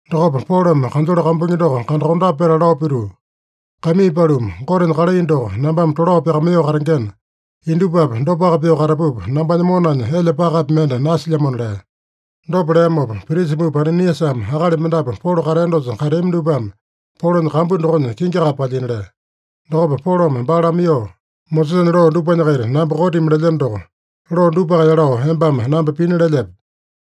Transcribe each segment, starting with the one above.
Dokopa Polome kanjole kambuingi doko kandakondape petala lao pituu, “Kaimii paluma, Gotenya kalai doko nambame tolao pyakamaiyoo katengena, indupapi dopaka pyoo katapupa, nambanya monanya elya pakapi mende nasilyamona” lea. Dopa leamopa, prisa mupa Ananiasame akali mendapu Polo katea dosa kateami dupame Polonya kambu dokonya kingi kape palyina lea. Dokopa Polome baa lamaiyoo, “Mosesanya loo dupanya-kaita namba kotimi lelyeno doko, loo dupaka yalao embame namba pina lelyepe?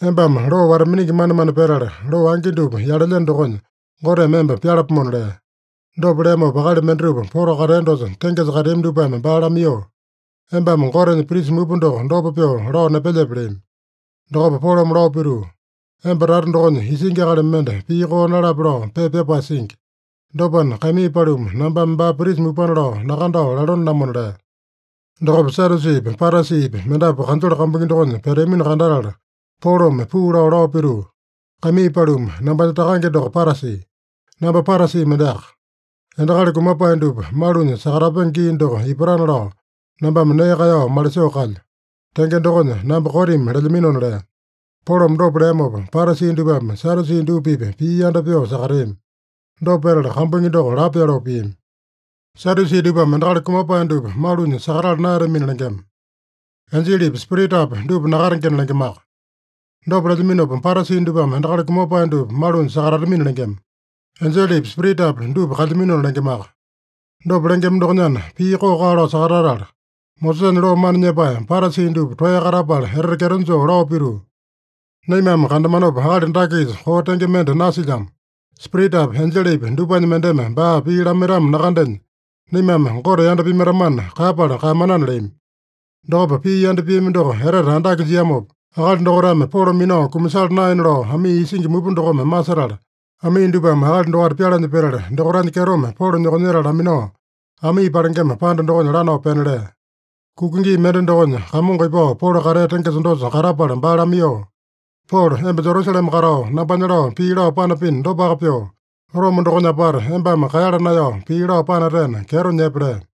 Embame loo wata-miningi manemane petala, loo angi dupa yalelyeno dokonya Goteme emba pyalapomona” lea. Dopa leamopa, akali mendatupa Polo katea dosa tengesa kateami dupame baa lamaiyoo, “Embame Gotenya prisa mupa doko dopa pyoo lao nepelyepe?” leami. Dokopa Polome lao pituu, “Emba tata dokonya isingi akali mende pii koo nalape lao pepa pyapae singi. Dopana, kaimii paluma, nambame baa prisa mupana lao nakandao lalone-lamona” lea. Dokopa Sadyusipi, Parasipi mendapu kanjole kambuingi dokonya peteamino kandatala, Polome puu lao, lao pituu, “Kaimii paluma, nambanya takange doko Parasi. Namba Parasi mendeaka. Endakali kumapae dupa malunya sakatapenge gii doko ipatana lao nambame nee kaeyao malisoo kalyo. Tenge dokonya namba kotimi lelyaminona” lea. Polome dopa leamopa, Parasi dupame Sadyusi dupa-pipa pii yanda pyoo sakateami. Dopa petala, kambuingi doko lapo pyoloo piami. Sadyusi dupame endakali kumapae dupa malunya sakatala naeyatamina lengema. Enjelepi, spiritapi dupa nakatengena lengemaka. Dopa lelyaminopa, Parasi dupame endakali kumapae dupa malunya sakatatamina lengema. Enjelepi, spiritapi dupa kalyaminona lengemaka. Dopa lengema dokonyana, pii koo-kaa lao sakatatala, Mosesanya loo mana nyepae Parasi dupa toeya katapala etete kyeto joo lao pituu, “Naimame kandamanopa, akali dake-kisa koo tenge mende nasilyamo. Spiritapi, enjelepi dupanya mendeme baa pii lamaitamo nakandenya, naimame Gote yanda pimaitamana kaeyapala kaeyamanana” leami. Dokopa pii yanda piami doko etete andake jiamopa, akali dokaitame Polo minao kumasala naena lao amii isingi mupa dokome masetala, amii dupame akali dokaita pyalanya petala, dokaitanya kyetome Polo nyokonyetala laminao, amii palengema panda dokonya lanao pena lea. Kuka gii mende dokonya, Kamongo ipao Polo katea tengesa dosa katapala baa lamaiyoo, “Polo, emba Jerusalema katao nambanya lao pii lao panapino dopaka pyoo, Roma dokonya apata embame kaeyala naeyao pii lao panatena, kyeto nyepe” lea.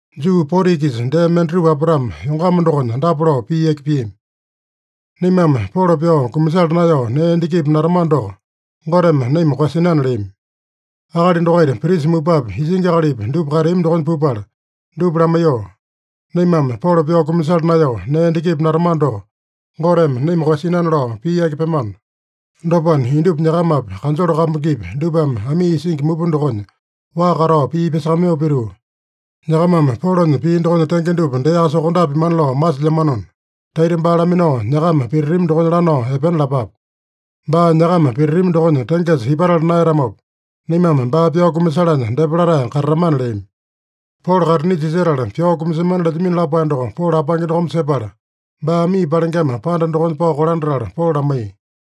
Juu 40-kisa dee mendatupa apatame yongama dokonya dapa lao pii yaki piami: “Naimame Polo pyao kumasala naeyao nee endakipi natamano doko, Goteme naima koeyasinana” leami. Akali dokaita prisa mupapi, isingi akalipi, dupa kateami dokonya pupala dupa lamaiyoo, “Naimame Polo pyao kumasala naeyao nee endakipi natamano doko, Goteme naima koeyasinana lao pii yaki pyemano. Dopana, indupa nyakamapi, kanjole kambuingipi, dupame amii isingi mupa dokonya waa katao pii pyasakamaiyoo pituu, nyakamame Polonya pii dokonya tenge dupa deaka sokondape pimana lao masilyamanona, taita baa laminao nyakama pititami dokonya lanao epena lapape. Baa nyakama pititami dokonya tengesa ipatala naeyatamopa, naimame baa pyao kumasalanya depa latae katatamana” leami. Polo kaitinisa isetala pyao kumasemana lelyamino lapae doko Polo apange dokome sepala, baa amii palengema panda dokonya pao kolandatala Polo lamaiya.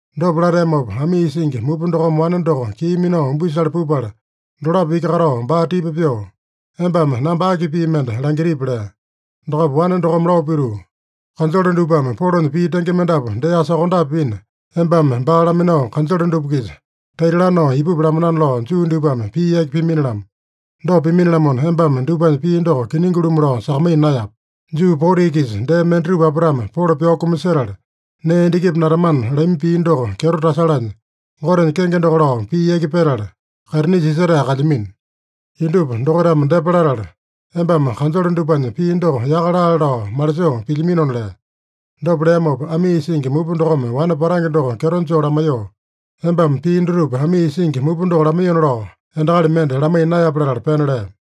Dopa lateamopa, amii isingi mupa dokome wane doko kii minao umbisale pupala dolapo iki katao baa tipa pyoo, “Embame namba aki pii mende langitipi?” lea. Dokopa wane dokome lao pituu, “Kanjole dupame Polonya pii tenge mendapu deaka sokondape pina, embame baa laminao kanjole dupa-kisa taita lanao ipupi lamanana lao Juu dupame pii yaki pimini-lamo. Dopa pimini-lamona, embame dupanya pii doko kiningi-lumu lao sakamaiya naeyape. Juu 40-kisa dee mendatupa apatame Polo pyao kumasetala nee endakipi natamana lami pii doko kyeto tasalanya, Gotenya kenge doko lao pii yaki petala, kaitinisa isetae kalyamino. Indupa dokaitame depa latala, embame kanjole dupanya pii doko yaka laale lao malisoo pilyaminona” lea. Dopa leamopa, amii isingi mupa dokome wane patange doko kyeto joo lamaiyoo, “Embame pii dutupa amii isingi mupa doko lamaiyona lao endakali mende lamaiya naeyape” latala pena lea.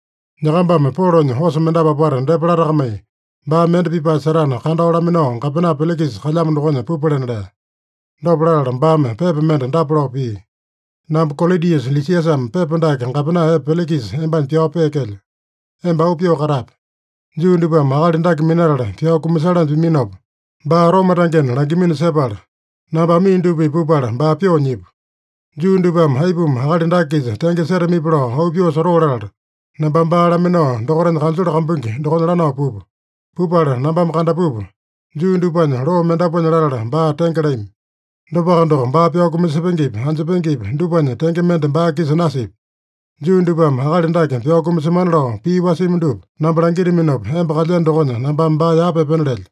Nyakambame Polonya osa mendapu apata depa latakamai, baa mende pipae setana kandao laminao, gapena Pelikisa kalyamo dokonya pupalena” lea. Dopa latala baame pepa mende dapa lao pia: “Namba Kolodiusa Lisiasame pepa dake gapena epe Pelikisa embanya pyao peekelyo. Emba auu pyoo katape. Juu dupame akali dake minatala pyao kumasalanya piminopa, baa Roma tangena langimino sepala, namba amii dupa-pipa pupala baa pyoo nyipu. Juu dupame aipuma akali dake-kisa tenge setamipi lao auu pyoo sotoo latala, nambame baa laminao dokaitanya kanjole kambuingi dokonya lanao pupu. Pupala nambame kandapupa, Juu dupanya loo mendapuanya latala, baa tenge lami. Dopaka doko, baa pyao kumasepengepi, anjepengepi, dupanya tenge mende baa-kisa nasipya. Juu dupame akali dake pyao kumasemana lao pii wasimi dupa namba langitaminopa, emba kalyeno dokonya nambame baa yapa epena lelyo.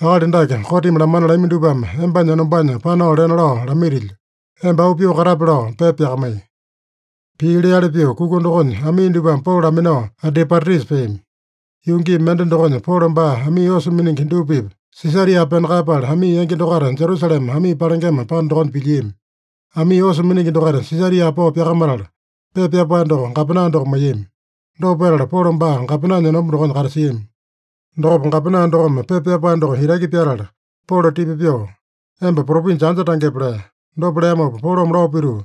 Akali dake kotimi lamana lami dupame embanya enombanya panao lena lao lamaitilyo. Emba auu pyoo katape” lao pepa pyakamaiya. Pii leali pyoo kuka dokonya, amii dupame Polo laminao Antipatrisa peami. Yuu gii mende dokonya, Polo baa amii osa miningi dupa-pipa Sisaria pena kaeyapala, amii yangi dokaita Jerusalema amii palengema panda dokonya pilyiami. Amii osa miningi dokaita Sisaria pao pyakamatala, pepa pyapae doko gapena doko maiyami. Dopa petala, Polo baa gapenanya enomba dokonya katasiami. Dokopa gapena dokome pepa pyapae doko itaki pyatala Polo tipa pyoo, “Emba propinja anja tangepe?” lea. Dopa leamopa Polome lao pituu,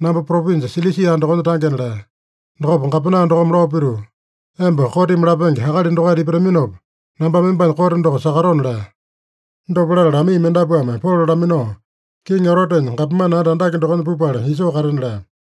“Namba propinja Silisia dokonya tangena” lea. Dokopa gapena dokome lao pituu, “Emba kotimi lapenge akali dokaita ipataminopa, nambame embanya kote doko sakatona” lea. Dopa latala amii mendapuame Polo laminao, Kiŋi Erotenya gapomane anda andake dokonya pupala isoo katena lea.